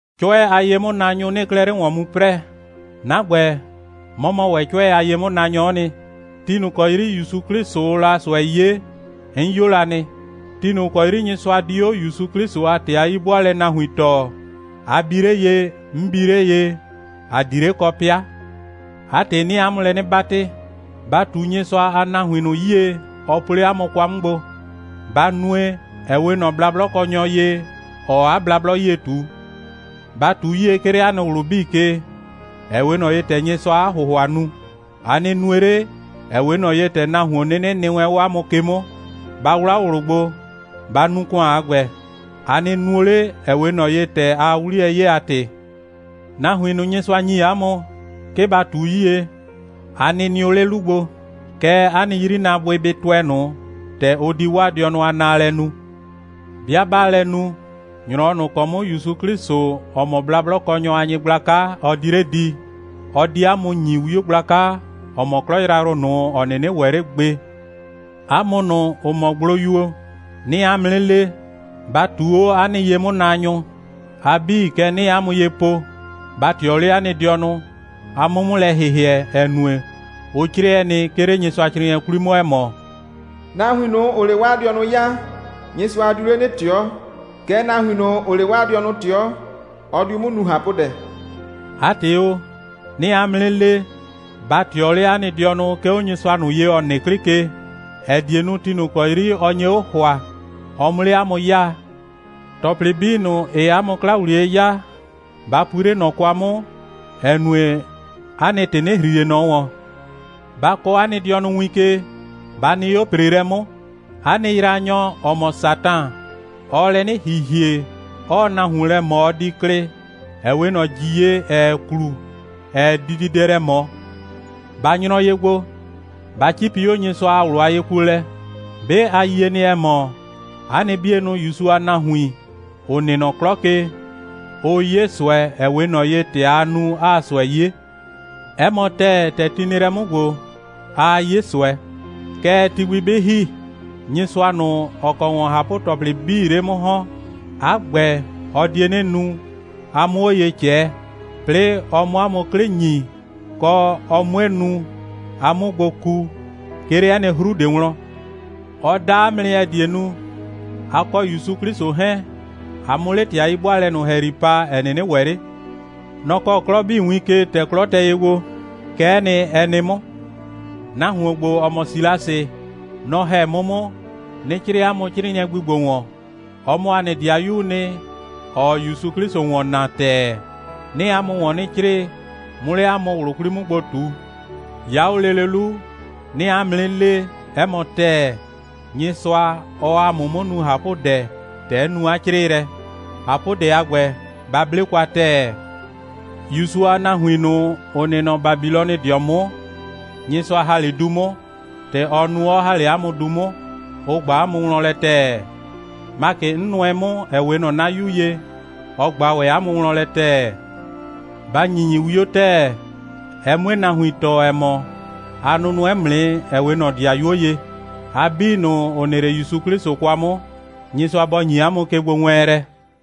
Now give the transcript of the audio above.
'Cʋɛ a ye'mʋnaanyʋ 'nɩɩ 'klɛɛ 'le ‑wɔn mu 'prɛɛ. 'Na ‑gbɛ, 'mɔ mɔ ‑wɛ 'cʋɛ a ye'mʋnaanyɔ'ɔ nɩ. Ti ꞊nʋ ‑kɔ 'yri ‑Yusu 'Klɩsʋʋ la ꞊sʋɛ 'ye, 'n 'yo la nɩ. Ti ꞊nʋ ‑kɔ 'yri Nyɩsʋa di 'o ‑Yusu 'Klɩsʋ a ‑tɩ a 'yi'bʋaalɛ nahuin tɔɔ, a bi 'le ye, 'n bi 'le ye, ‑a di 'le kɔ 'pɩa. 'A ‑tɩ, 'nɩɩ 'a mʋ lɛ 'nɩ 'batɩ, ba ꞊tu Nyɩsʋa a nahuin ꞊nʋ 'yie, ɔ po 'le 'a mʋ kwa 'mʋ gbo. Ba nue, ‑ɛ 'we ꞊nɔ blablɔkɔnyɔ ye, ‑ɔɔ 'a blablɔ 'yie ꞊tu. Ba ꞊tu 'yie, 'ke 'le 'a nɩ ꞊wlʋ 'bii ke, ‑ɛ 'we ꞊nɔ ye, ‑tɛ Nyɩsʋaa 'a ‑hʋhʋa nu. A nɩ nue 'le, ‑ɛ 'we ꞊nɔ ye, ‑tɛ nahuon 'nɩnɩ nɩ wɛn 'o 'a mʋ ke 'mʋ. Ba 'wlaa 'o ꞊wlʋ gbo, ba nu ‑kʋan a ‑gbɛ. A nɩ nuo 'le, ‑ɛ 'we ꞊nɔ ye, ‑tɛ aa 'wliyɛ 'ye a ‑tɩ. Nahuin ꞊nʋ, Nyɩsʋa ‑nyi 'a mʋ, 'ke ba ꞊tu 'yie, a nɩ nɩʋ 'le 'lu gbo. Kɛɛ, 'a nɩ 'yrinaabʋɩ bɩ tʋɛ ꞊nʋ, ‑tɛ ʋ di 'waa dɩɔnʋ a naalɛ nu. 'Bɩa 'baa lɛ nu, ‑nyrɔwɔ ꞊nʋ ‑kɔ 'mʋ ‑Yusu 'Klɩsʋ, ‑ɔ mɔ blablɔkɔnyʋ a Nyɩgblaka, ɔ di 'le di, ɔ di 'a mʋ ‑nyi 'wio gblaka, ‑ɔ mɔ 'klɔ yrayrʋ ꞊nʋ, ‑ɔ 'nɩnɩ ‑wɛ 'le gbe. 'A mʋ ꞊nʋ, ‑ʋ mɔ gbloyuo, 'nɩɩ 'a mʋ 'nɩ le, ba ꞊tuu 'o 'a nɩ ye'mʋnaanyʋ. A 'bii, kɛ 'nɩɩ 'a mʋ ye po, ba ꞊tɩɔ 'le 'a nɩ dɩɔnʋ, a 'mʋ 'mʋ lɛ ‑hɩhɩɛ, ‑ɛ nue, ʋ 'crɛɛ nɩ, 'ke 'le Nyɩsʋacrɩɩnɩɛ 'kwli 'mʋ, ‑ɛ mɔ: «Nahuin ꞊nʋ, ‑ʋʋ 'le 'waa dɩɔnʋ 'yaa, Nyɩsʋa diu 'le 'nɩ ꞊tɩɔ. Kɛɛ, nahuin ꞊nʋ, ‑ʋʋ 'le 'waa dɩɔnʋ ꞊tɩɔ, ɔ diu 'mʋ nu ꞊hapʋdɛ.» 'A ‑tɩ o, 'nɩɩ 'a mʋ 'nɩ le, ba ꞊tɩɔ 'le 'a nɩ dɩɔnʋ, 'ke 'o Nyɩsʋa ꞊nʋ ye, ‑ɔ nɩ 'klɩ ke, ‑ɛ die nu, ti ꞊nʋ ‑kɔ 'yri ɔ nye 'o ‑hʋa, ɔ 'mʋ 'le 'a mʋ 'yaa. ‑Tɔplɩ 'bii ꞊nʋ, ‑ɩɩ 'a mʋ 'kla ‑wliye 'yaa, ba pui 'le ꞊nɔ kwa 'mʋ, ‑ɛ nue, 'a nɩ ‑tɩ 'nɩ ‑hri ꞊le ꞊nɔ ‑wɔn. Ba kɔɔ 'a nɩ dɩɔnʋ win ke, ba nɩ 'o ‑preelɛ 'mʋ! 'A nɩ yraanyɔ, ‑ɔ mɔ Satan, ɔɔ lɛ 'nɩ ‑hihie, 'ɔɔ nahuon lɛ ꞊mɔ, ɔ di klɩ, ‑ɛ 'we ꞊nɔ ‑ji ye, ‑ɛɛ klu, ‑ɛɛ dididɛ lɛ ꞊mɔ. Ba nyrɔ ye gbo, ba 'cipi 'o Nyɩsʋa a ꞊wlʋ a yekuolɛ. 'Be a yie nɩ, ‑ɛ mɔ, 'a nɩ 'bienʋ ‑Yusu a nahuin, ‑ʋ nɩ nɔ 'klɔ ke, ʋʋ 'ye ꞊sʋɛ, ‑ɛ 'we ꞊nɔ ye, ‑tɛ aa nu, 'aa ꞊sʋɛ 'ye. 'Ɛ mɔ ‑tɛɛ, ‑tɛ ti nɩ lɛ 'mʋ ‑gbo, aa 'ye ꞊sʋɛ. Kɛɛ, ti gbi 'bɩ ‑hi, Nyɩsʋa ꞊nʋ, ‑ɔ kɔ ‑wɔn ꞊hapʋ‑tɔplɩ 'bii 'le 'mʋ ‑hɔn, 'a ‑gbɛ, ɔ die 'nɩ nu, a 'mʋ 'o ye ꞊cɛɛ, 'plɩɩ ɔ 'mʋ 'a mʋ 'klɩ ‑nyi, kɔ, ɔ 'mue nu, a 'mʋ gbo ku, 'ke 'le 'ɛ nɩ 'hru ꞊de wlɔn. Ɔ da 'a mʋ nɩ, ‑ɛ die nu, a kɔ ‑Yusu 'Klɩsʋ 'hɛɛn, a 'mʋ 'le 'a ‑tɩ a 'yi'bʋaalɛ ꞊nʋ ‑hɛyri pa, ‑ɛ 'nɩnɩ ‑wɛ 'le. Nɔ‑ kɔɔ 'klɔ 'bii win ke, ‑tɛ 'klɔ tɛ ye gbo. Kɛ'ɛ nɩ, ɛ nɩ 'mʋ. Nahuon ‑gbo, ‑ɔ mɔ Silasɩ, nɔ‑ ‑hɛ 'mʋ 'mʋ, 'nɩ 'crɩɩ 'a mʋ 'crɩɩnɩɛ gbi ‑gbo ‑wɔn. Ɔ mɔ ‑a nɩ ‑dɩayuu nɩ, ‑ɔɔ ‑Yusu 'Klɩsʋ ‑wɔn naa ‑tɛɛ. 'Nɩɩ 'a mʋ ‑wɔn 'nɩ 'crɩɩ, 'mʋ 'le 'a mʋ ꞊wlʋ 'kwli 'mʋ gbo ꞊tu. 'Ya 'o lele 'lu, 'nɩɩ 'a mʋ 'nɩ le, 'ɛ mɔ ‑tɛɛ, Nyɩsʋa, ɔɔ ‑a mʋ 'mʋ nu ꞊hapʋdɛ, ‑tɛ 'n nu 'a 'crɩɩlɛ. ꞊Hapʋdɛ a ‑gbɛ, ba 'ble kwa ‑tɛɛ. ‑Yusu a nahuin ꞊nʋ, ‑ʋ nɩ nɔ Babilɔnɩdɩɔ 'mʋ, Nyɩsʋa ‑ha 'le du 'mʋ, ‑tɛ ɔ nu, 'ɔ ‑ha 'le 'a mʋ du 'mʋ, ʋ ꞊gba 'a mʋ wlɔn lɛ ‑tɛɛ. Makɩ, 'n nʋɛ 'mʋ, ‑ɛ 'we ꞊nɔ 'na 'yu ye, ɔ ꞊gba ‑wɛ 'a mʋ wlɔn lɛ ‑tɛɛ. Ba ‑nyinyi 'wio ‑tɛɛ, ɛ 'mue nahuin tɔɔ, ‑ɛ mɔ, a nʋnʋɛ 'mʋ nɩ, ‑ɛ 'we ꞊nɔ ‑dɩayuo ye. A 'bii ꞊nʋ, ‑ʋ nɩ 'le ‑Yusu 'Klɩsʋ kwa 'mʋ, Nyɩsʋa bɔ ‑nyi 'a mʋ kegbowɛɛnlɛ.